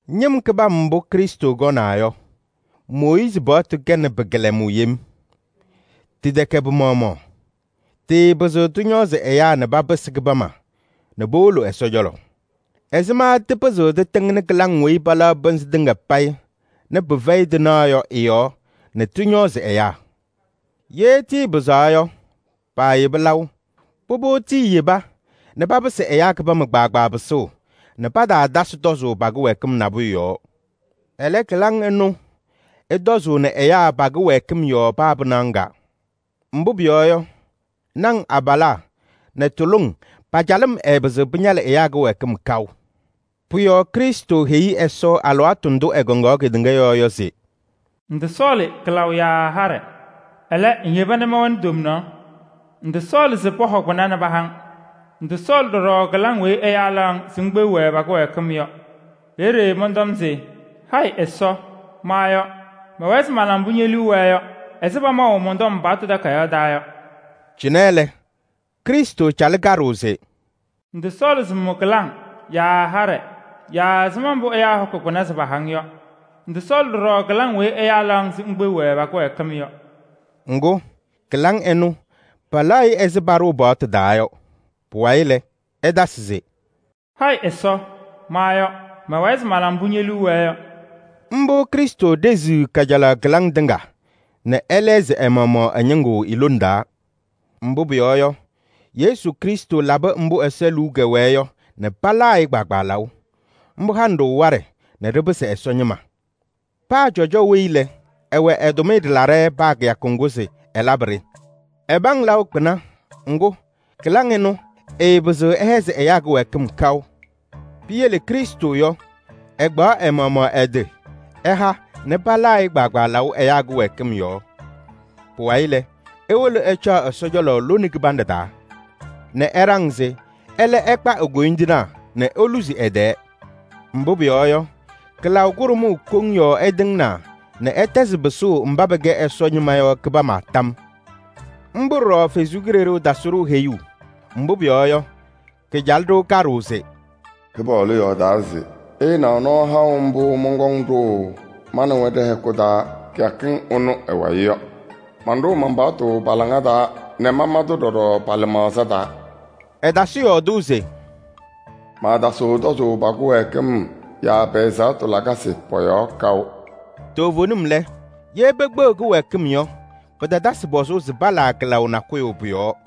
Ñɩm kɩbam mbʋ Krɩstʋ kɔnaa yɔ, Mooyiizi paɣtʋ kɛnɩ pɩ-kɩlɛmʋʋ yem. Tɩtɛkɛ pɩ-maɣmaɣ. Tɩɩpɩzɩɣ tɩñɔɔzɩ ɛyaa nɛ papɩsɩ kɩbama nɛ powolo Ɛsɔ cɔlɔ: ɛzɩma tɩpɩzɩɣ tɩtɩŋnɩ kɩlaŋ weyi palaɣ pɩnzɩ tɩŋa payɩ nɛ pɩfɛyɩ tɩnaɣ yɔ ɩ-yɔɔ nɛ tɩñɔɔzɩ ɛyaa? Ye tɩɩpɩzaɣ yɔ, paayeba laʋ. Pʋbʋ, tiiyeba nɛ papɩsɩ ɛyaa kɩbama kpaagbaa pɩsʋʋ nɛ pataatasɩ tɔzʋʋ pa-kɩwɛɛkɩm nabʋyʋ yɔɔ. Ɛlɛ, kɩlaŋ ɩnʋ ɩtɔzʋʋnɩ ɛyaa pa-kɩwɛɛkɩm yɔɔ paa pɩnaɣ ŋga. Mbʋ pʋyɔɔ yɔ, naŋ abalaa nɛ tuluŋ pa-calɩm ɛɛpɩzɩɣ pɩñalɩ ɛyaa kɩwɛɛkɩm kaʋ. Pʋ-yɔɔ Krɩstʋ heyi Ɛsɔ alɩwaatʋ ndʋ ɛkɔŋaɣ kedeŋa yɔɔ yɔ se: “Ŋtɔsɔɔlɩ kɩlaʋ yaa haɖɛ. Ɛlɛ, ŋyeba nɛ mɛwɛnɩ tomnaɣ. Ŋtɔsɔɔlɩ se pɔhɔ kpɩna nɛ paha-ŋ. Ŋtɔsɔɔlɩ ɖɔɖɔ kɩlaŋ weyi ɛyaa laɣ-ŋ se ŋkpeɣ-wɛ pa-kɩwɛɛkɩm yɔ. Peeye mɔntɔm se: ‘Hayɩ Ɛsɔ! Ma yɔ: mɛwɛɛ se mala mbʋ ñe-liu wɛɛ yɔ ɛzɩ pamaʋ mɔn-tɔm paɣtʋ takayaɣ taa yɔ.’” Cɩnɛ lɛ, Krɩstʋ calɩ kaɖʋʋ se: “Ŋtɔsɔɔlɩ se ŋmʋ kɩlaŋ yaa haɖɛ yaa ɛzɩma mbʋ pɔhɔkɩ kpɩna se paha-ŋ yɔ. Ŋtɔsɔɔlɩ ɖɔɖɔ kɩlaŋ weyi ɛyaa laɣ-ŋ se ŋkpeɣ-wɛ pa-kɩwɛɛkɩm yɔ.” Ŋgʋ, kɩlaŋ ɩnʋ palaɣ-ɩ ɛzɩ paɖʋʋ paɣtʋ taa yɔ. Pʋwayɩ lɛ, ɛtasɩ se: “Hayɩ Ɛsɔ! Ma yɔ: mɛwɛɛ se mala mbʋ ñe-liu wɛɛ yɔ.” Mbʋ Krɩstʋ ɖeziɣ kajalaɣ kɩlaŋ tɩŋa nɛ ɛlɛɣzɩ ɛ-maɣmaɣ ɛ-ñɩŋgʋ i-lone taa. Mbʋ pʋyɔɔ yɔ, Yesu Krɩstʋ labɩ mbʋ Ɛsɔ liu kɛwɛɛ yɔ nɛ palaa-ɩ kpaagbaa laʋ. Mbʋ hanɩ-ɖʋ waɖɛ nɛ ɖɩpɩsɩ Ɛsɔ ñɩma. Paa cɔjɔ weyi lɛ, ɛwɛ ɛ-tʋmɩyɛ ɖɩlaɖɛ paa kɩyakʋ ŋgʋ se ɛlabɩ-ɖɩ. Ɛpaŋ laʋ kpɩna, ŋgʋ, kɩlaŋ ɩnʋ ɩɩpɩzɩɣ ɩhɛzɩ ɛyaa kɩwɛɛkɩm kaʋ. Piyele Krɩstʋ yɔ, ɛkpaɣ ɛ-maɣmaɣ ɛ-tɩ ɛha nɛ palaa-ɩ kpaagbaa laʋ ɛyaa kɩwɛɛkɩm yɔɔ. Pʋwayɩ lɛ, ewolo ɛcaɣ Ɛsɔ cɔlɔ lone kɩbanɖɛ taa nɛ ɛɖaŋ se ɛlɛ ɛkpa e-koyindinaa nɛ eluzi ɛ-tɛɛ. Mbʋ pʋyɔɔ yɔ, kɩlaʋ kʋɖʋmʋʋ koŋ yɔɔ ɛtɩŋnaa nɛ ɛtɛzɩ pɩsʋʋ mba pɛkɛ Ɛsɔ ñɩma yɔ kɩbama tam yɔɔ. Mbʋ ɖɔɖɔ Ɛsɔ Kalɩzaɣ tasɩ-ɖʋ heyuu. Mbʋ pʋyɔɔ yɔ, kacalɩ-ɖʋ kaɖʋʋ se: “Kɩpaɣlʋ yɔɔdaa se: ‘Ɩɩnaɣ nɔɔ haʋ mbʋ mɔnkɔŋ ɖʋʋ ma nɛ wɛ ɖɛ-hɛkʋ taa kɩyakɩŋ ɩnʋ ɩ-wayɩ yɔ. Manɖʋʋ man-paɣtʋ pa-laŋa taa nɛ mama-tʋ ɖɔɖɔ pa-lɩmaɣza taa.’” Ɛtasɩ yɔɔdʋʋ se: “Maatasɩɣ tɔzʋʋ pa-kɩwɛɛkɩm yaa pɛ-ɛzaɣtʋ lakasɩ pɔ-yɔɔ kaʋ.” Toovenim lɛ, ye pekpeɣ kɩwɛɛkɩm yɔ, pɩtatasɩ pɔzʋʋ se palaa kɩlaʋ nakʋyʋ pʋ-yɔɔ.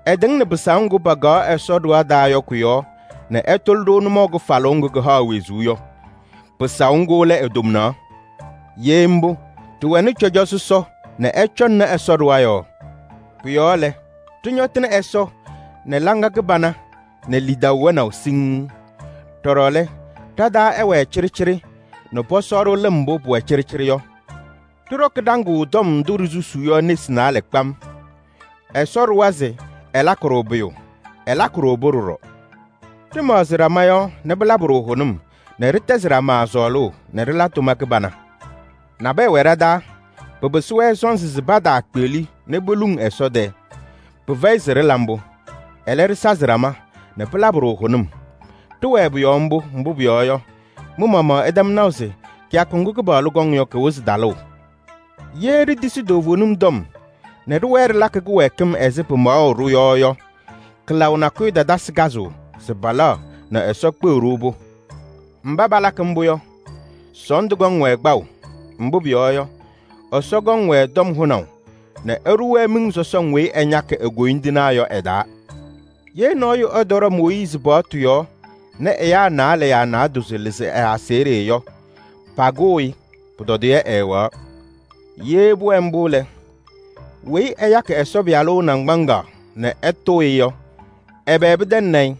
Ɛtɩŋnɩ pɩsaʋ ŋgʋ pakaɣ Ɛsɔ ɖɩɣa taa yɔ kʋ-yɔɔ nɛ ɛtʋlɩ-ɖʋ nʋmɔʋ kɩfalʋʋ ŋgʋ kɩhaɣ wezuu yɔ. Pɩsaʋ ŋgʋ lɛ e-tomnaɣ. Ye mbʋ, ɖɩwɛnɩ cɔjɔ sɔsɔ nɛ ɛcɔŋnɩ Ɛsɔ ɖɩɣa yɔɔ. Pʋ-yɔɔ lɛ, ɖɩñɔtɩnɩ Ɛsɔ nɛ hɔ kɩbana nɛ lidaʋ wɛnaʋ siŋŋ. Ɖɔɖɔ lɛ, ɖa-taa ɛwɛɛ cɩɖɩcɩɖɩ nɛ pɔsɔ-ɖʋ lɩm mbʋ pʋwɛ cɩɖɩcɩɖɩ yɔ. Ɖɩɖɔkɩ ɖaŋʋʋ tɔm ndʋ ɖisusuu yɔ nesi naalɛ kpam. Ɛsɔ ɖʋwa se ɛlakɩ-ɖʋ pʋyʋ, ɛlakɩ pʋ-yɔɔ. Ɖɩmaɣzɩ ɖama yɔɔ nɛ pɩlabɩ-ɖʋ hʋnʋm nɛ ɖɩtɛzɩ ɖama sɔɔlʋʋ nɛ ɖɩla tʋma kɩbana. Nabɛyɛ wɛ ɖa-taa, pɩpɩsɩ-wɛ sɔnzɩ se pataakpeɣli nɛ poluŋ Ɛsɔ tɛɛ. Pɩfɛyɩ se ɖɩla mbʋ. Ɛlɛ, ɖɩsazɩ ɖama nɛ pɩlabɩ-ɖʋ hʋnʋm. Ɖɩwɛɛ pʋ-yɔɔ mbʋ, mbʋ pʋyɔɔ yɔ, mɩ-maɣmaɣ ɩtɛm naʋ se kɩyakʋ ŋgʋ Kɩpaɣlʋ kɔŋ yɔ, kɩwɩzɩ talʋʋ. Ye ɖitisi toovenim tɔm nɛ ɖɩwɛɛ ɖɩlakɩ kɩwɛɛkɩm ɛzɩ pɩmaɣʋ-ɖʋ yɔ yɔ, kɩlaʋ nakʋyʋ tatasɩ kazʋʋ se palaɣ nɛ Ɛsɔ kpeɣ-ɖʋ-pʋ. Mba palakɩ mbʋ yɔ, sɔɔndʋ kɔŋ-wɛ kpaʋ. Mbʋ pʋyɔɔ yɔ, Ɛsɔ kɔŋ-wɛ tɔm hʋnaʋ nɛ ɛɖʋ-wɛ miŋ sɔsɔŋ weyi ɛñakɩ e-koyindinaa yɔ ɛ-taa. Ye nɔɔyʋ ɛtɔɖɔ Mooyiizi paɣtʋ yɔɔ nɛ ɛyaa naalɛ yaa naadozo lɩzɩ ɛ-aseɣɖe yɔ, pakʋʋ-ɩ, pʋtɔdɩyɛ ɛɛwɛɣ. Ye pʋwɛ mbʋ lɛ, weyi ɛyakɩ Ɛsɔ Pɩyalʋ naŋgbaŋaɣ nɛ ɛtʋʋ-ɩ yɔ, ɛbɛ pɩtɛŋnɩ-ɩ?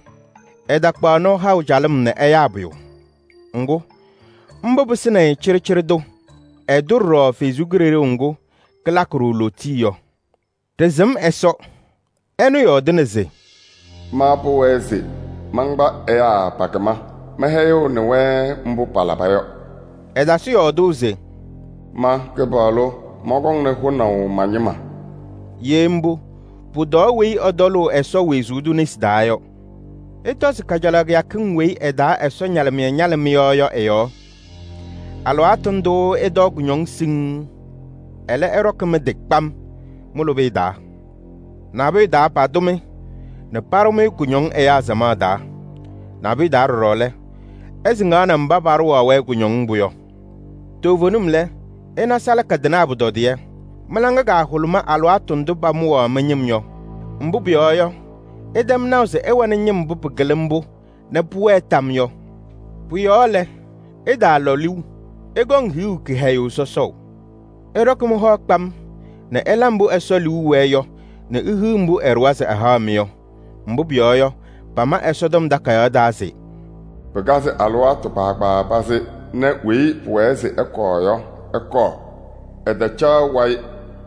Ɛtakpaɣ nɔɔ haʋ calɩm nɛ ɛyaa pʋyʋ. Ŋgʋ, mbʋ pɩsɩnɩ-ɩ cɩɖɩcɩɖɩ tʋ. Ɛtʋ ɖɔɖɔ Ɛsɔ Kalɩzaɣ ŋga kalakɩ-ɖʋ lootiye yɔ. Ɖɩsɩm Ɛsɔ, ɛnʋ yɔɔdɩna se: “Ma pʋwɛɛ se mankpa ɛyaa pa-kɩma. Mɛhɛyɩɣnɩ-wɛ mbʋ palaba yɔ.” Ɛtasɩ yɔɔdʋʋ se: “Ma Kɩpaɣlʋ mɔnkɔŋnɩ hʋnaʋ ma-ñɩma.” Ye mbʋ, pʋtɔɔ weyi ɛtɔlʋʋ Ɛsɔ wezuu tʋ nesi taa yɔ! Ɩtɔzɩ kajalaɣ kɩyakɩŋ weyi ɩ-taa Ɛsɔ ñalɩmɩyɛ ñalɩ mɩ-yɔɔ yɔ ɩ-yɔɔ. Alɩwaatʋ ndʋʋ ɩtɔɔ kʋñɔŋ siŋŋ. Ɛlɛ, ɩɖɔkɩ mɩ-tɩ kpam mɩ-lʋbɩyɛ taa. Nabʋyʋ taa, patʋ-mɩ nɛ paɖʋ-mɩ kʋñɔŋ ɛyaa samaɣ taa. Nabʋyʋ taa ɖɔɖɔ lɛ, ɩsɩŋaɣnɩ mba paɖʋwaɣ-wɛ kʋñɔŋ mbʋ yɔ. Toovenim lɛ, ɩna salaka tɩnaa pʋtɔdɩyɛ. Mɩ-laŋa kahʋlʋmɩ alɩwaatʋ ndʋ pamʋwaɣ mɩ-ñɩm yɔ. Mbʋ pʋyɔɔ yɔ, ɩtɛm naʋ se ɩwɛnɩ ñɩm mbʋ pɩkɩlɩ mbʋ nɛ pʋwɛɛ tam yɔɔ yɔ. Pʋ-yɔɔ lɛ, ɩtaalɔ liu: ɩkɔŋ hiɣu kɩhɛyʋʋ sɔsɔʋ. Ɩɖɔkɩ mɩ-hɔ kpam nɛ ɩla mbʋ Ɛsɔ liu wɛɛ yɔ nɛ ihiɣ mbʋ ɛɖʋwa se ɛhaɣ-mɩ yɔ. Mbʋ pʋyɔɔ yɔ, pama Ɛsɔtɔm Takayaɣ taa se: “Pɩkazɩ alɩwaatʋ kpaagbaa pazɩ nɛ weyi pʋwɛɛ se ɛkɔɔ yɔ, ɛkɔɔ. Ɛtalaɣ wayɩ.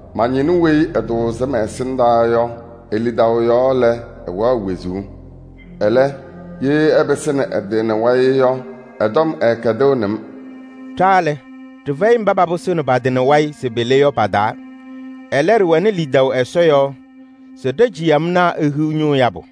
Ma-ñɩnʋ weyi ɛtʋʋzɩ mɛ-ɛsɩndaa yɔ, e-lidaʋ yɔɔ lɛ, ɛwɛɣ wezuu. Ɛlɛ, ye ɛpɩsɩnɩ ɛ-tɩ nɛ wayɩ yɔ, ɛ-tɔm ɛɛkɛdɩɣnɩ-m.” Ɖa lɛ, ɖɩfɛyɩ mba papɩsɩɣnɩ pa-tɩ nɛ wayɩ se pele yɔ pa-taa. Ɛlɛ, ɖɩwɛnɩ lidaʋ Ɛsɔ yɔɔ se ɖa-ciyamnaa ehiɣ ñʋʋ yabʋ.